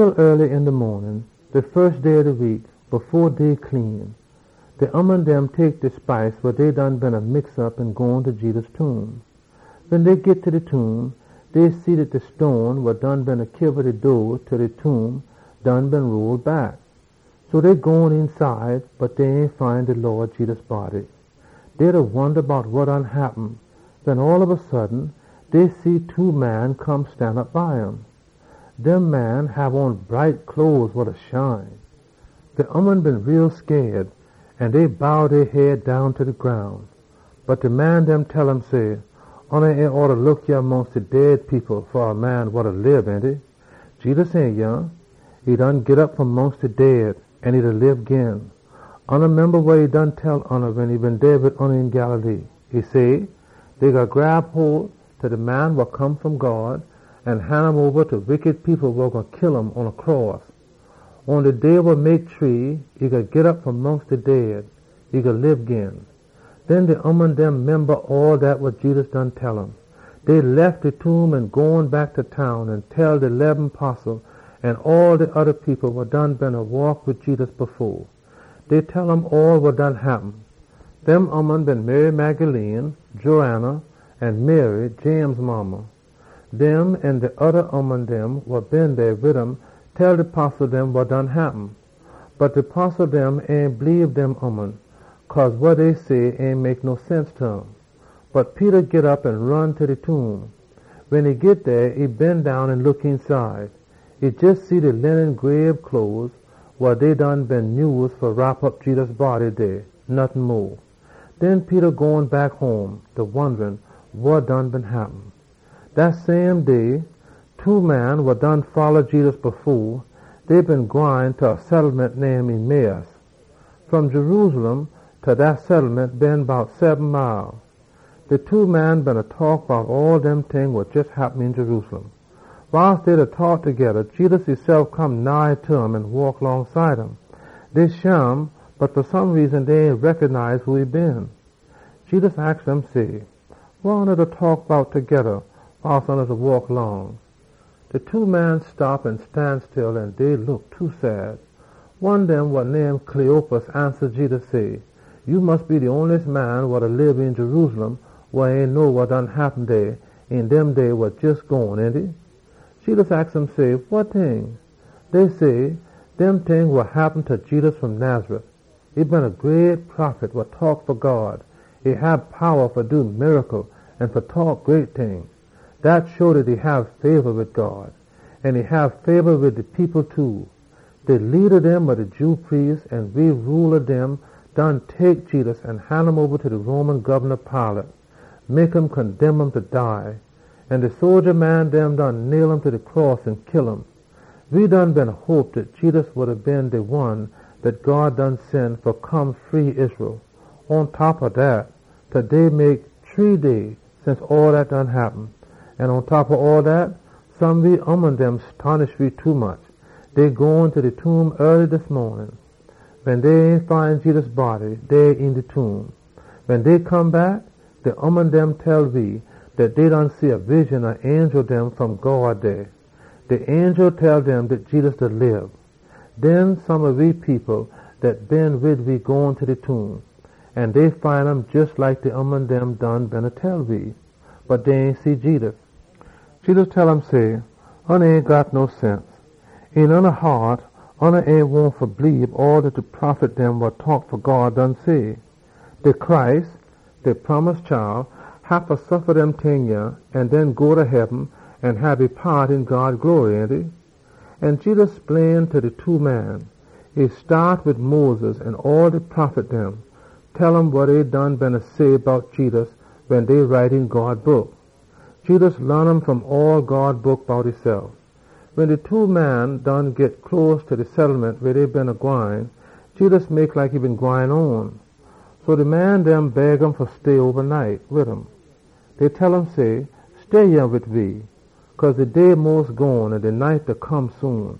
Aaly een de maanin de fus day ob de week, fo day clean, de ooman dem tek de spice wa dey done been mix op an gone ta Jedus tomb. Wen dey git ta de tomb, dey see dat de stone wa beena kiba de door ta de tomb done been roll back. So dey gone eenside, bot dey ain find de Lawd Jedus body. Dey beena wonda bout wa done happen, wen all ob a sudden dey see two man da stanop dey wa hab on bright cloes wa da shine. De ooman dem been too scaid, an dey bow dey head down ta de groun. Bot de man dem tell um say, “Oona ain oughta look yah mongst de dead people fa a man wa da lib, ainty? Jedus ain yah. E done git op fom mongst de dead, an e da lib gin! Oona memba wa e been tell oona wen e been dey wid oona een Galilee. E say, ‘Dey gwine grab hole ta de Man wa Come fom God an han um oba ta wickity people wa gwine kill um pon a cross. Atta shree day e gwine git op fom mongst de dead an lib gin.’” Den de ooman dem memba all dat wa Jedus been tell um. Dey lef de tomb an gone back ta town an tell de leben postle dem an all de oda people wa beena waak wid Jedus, bout all wa done happen. Dem ooman been Mary Magdalene, Joanna, an Mary, James modda. Dem an de oda ooman dem wa been dey wid um tell de postle dem wa done happen. Bot de postle dem ain bleebe dem ooman, cause wa dey say ain mek no sense ta um. Bot Peter git op an ron ta de tomb. Wen e git dey, e bend down an e look eenside. E jes see de linen grabe cloes wa dey been nyuse fa wrop op Jedus body dey, nottin mo. Den Peter gone back home, da wonda wa been happen. Dat same day, two man wa beena folla Jedus, dey beena gwine ta a settlement name Emmaus. Fom Jerusalem ta dat settlement been bout seben mile. De two man beena taak bout all dem ting wa jes happen een Jerusalem. Wiles dey beena taak, Jedus esef come nigh ta um an waak longside um. Dey shim, bot dey ain recognize who e been. Jedus aks dem say, “Wa oona da taak bout togeda wiles oona da waak long?” De two man stop an stan still, an dey look too sad. One dem wa name Cleopas ansa Jedus say, “Ya mus be de onliest man wa da lib een Jerusalem an ain know wa been happen dey een dem day wa jes gone, ainty?” Jedus aks dem say, “Wa ting?” Dey say, “Dem ting wa happen ta Jedus fom Nazareth. E been a great prophet. E hab powa fa do miracle an fa taak great ting. E hab fabor wid God an wid all de people too. De leada dem ob de Jew priest dem an we rula dem done tek Jedus an han um oba ta de Roman Gobna Pilate fa condemn um fa dead. An de sodja dem nail um ta de cross an kill um. We been tink dat Jedus been gwine free de Israel people! Pontop ob dat, taday mek shree day since all dat happen. An pontop ob all dat, some we ooman dem stonish we tommuch. Dey gone ta de tomb aaly dis maanin, bot dey ain find Jedus body dey een de tomb. Wen dey come back, de ooman dem tell we dat dey been see a wision ob angel fom God dey. De angel dem tell um dat Jedus da lib. Den some we people dat been wid we gone ta de tomb, an dey find um jes like de ooman dem beena tell we. Bot dey ain see Jedus.” Jedus tell um say, “Oona ain got no sense. Een oona haat oona ain wahn fa bleebe all dat de prophet dem done say! De Messiah haffa suffa dem ting an den go ta heaben an hab e paat een God glory, ainty?” An Jedus splain ta de two man dem. E staat wid Moses an all de prophet dem, da laan um wa dey been write bout um. Jedus laan um fom all God Book bout esef. Wen de two man done git close ta de settlement weh dey beena gwine, Jedus mek like e been gwine on. So de man dem beg um fa stay wid um. Dey tell um say, “Stay yah wid we, cause de day mos gone an de night da come soon.”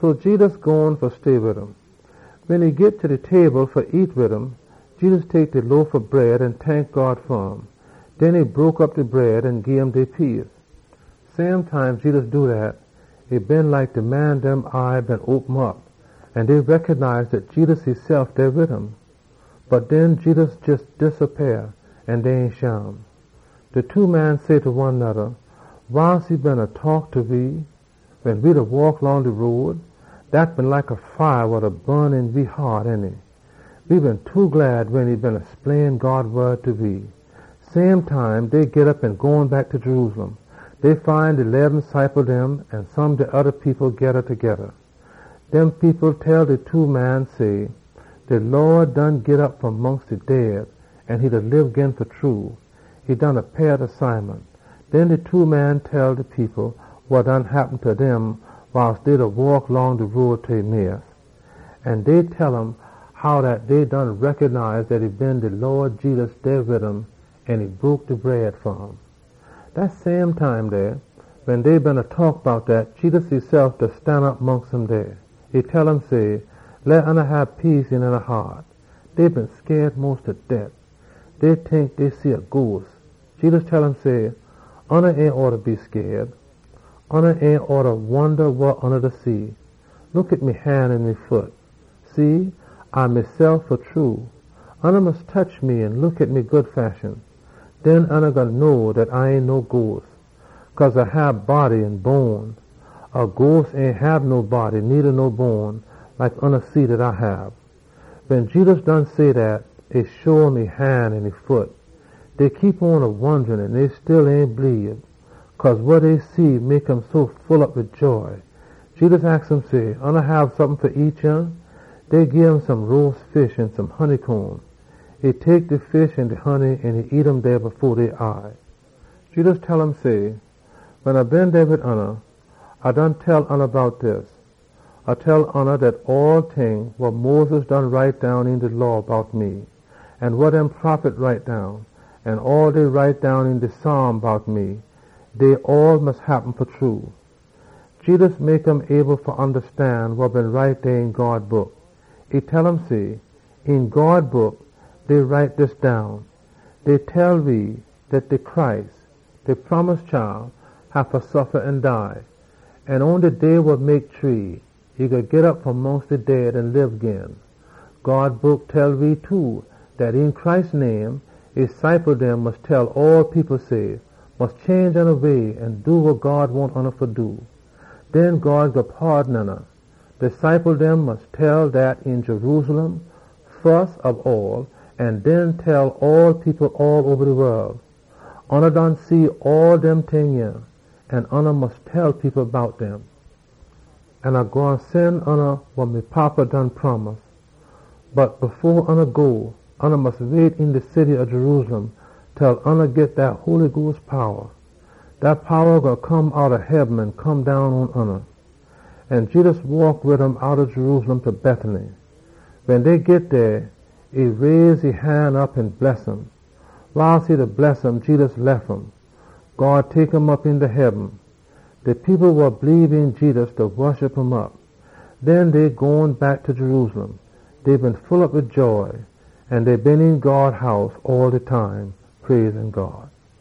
So Jedus gone fa stay wid um. Wen e git ta de table fa nyam wid um, Jedus tek de loaf ob bread an tank God fa um. Den e broke op de bread an gim dey piece. Same time Jedus do dat, e been like de man dem eye been open op, an dey recognize dat Jedus esef dey wid um. Bot den Jedus jes disappeah an dey ain shim. De two man dem say ta one noda, “Wiles e beena taak ta we, wen we beena waak long de road, dat been like a fire wa da bun een we haat, ainty? We been too glad wen e beena splain God Book ta we.” Same time, dey git op an gone back ta Jerusalem. Dey find de leben ciple dem an some de oda people geda togeda. Dem people tell de two man dem say, “De Lawd done git op fom mongst de dead an e da lib gin fa true! E done appeah ta Simon!” Den de two man dem tell de people wa happen ta dem wiles dey beena waak long de road ta Emmaus. Dey tell um how dey been recognize dat e been de Lawd Jedus dey wid um wen e broke op de bread fa um. Dat same time dey, wen dey beena taak bout dat, Jedus esef stanop mongst um dey. E tell um say, “Hab peace een oona haat!” Dey been scaid mos ta det. Dey tink dey beena see a haant. Jedus tell um say, “Oona ain oughta be scaid. Oona ain oughta wonda wa oona da see. Look pon me han an me foot. See, A mesef fa true! Oona mus tetch me an look pon me good fashion. Den oona gwine know dat A ain no haant. A haant ain hab no body needa no bone like oona see dat A hab.” Wen Jedus done say dat, e show um e han an e foot. Dey beena wonda an dey still ain know wa fa tink, cause wa dey see mek um so full op wid joy. Jedus aks um say, “Oona hab sompin fa nyam yah?” Dey gim some roas fish an some honeycomb. E tek de fish an honey an nyam um dey fo dey eye. Jedus tell um say, “Wen A been dey wid oona, A done tell oona bout dis. A tell oona dat all ting wa Moses been write down een de Law bout me, an wa dem prophet write down, an all dey write down een de Psalms bout me, dey all haffa happen fa true.” Jedus mek um able fa ondastan wa been write dey een God Book. E tell um say, “Een God Book dey write dis down: Dey tell we dat de Messiah haffa suffa an dead. An atta shree day, e gwine git op fom mongst de dead an lib gin. God Book tell we too dat een Christ name, e ciple dem mus tell all people say, ‘Mus change oona way an do wa God wahn oona fa do. Den God gwine paadon oona.’ Oona mus tell um dat een Jerusalem an den all oba de wol. Oona done see all dem ting yah, an oona mus tell people bout dem. An A gwine sen oona wa me Fada done promise. Bot fo oona go, oona mus wait een de city til oona git dat Holy Sperit powa wa gwine come outta heaben an come down pon oona.” An Jedus waak wid um outta Jerusalem ta Bethany. Wen dey git dey, e raise e han op an e bless um. Wiles e beena bless um, Jedus lef um. God tek um op eenta heaben. De people wa bleebe een Jedus woshup um op, an den dey gone back ta Jerusalem. Dey been full op wid joy. An dey been een God House all de time, da praise God.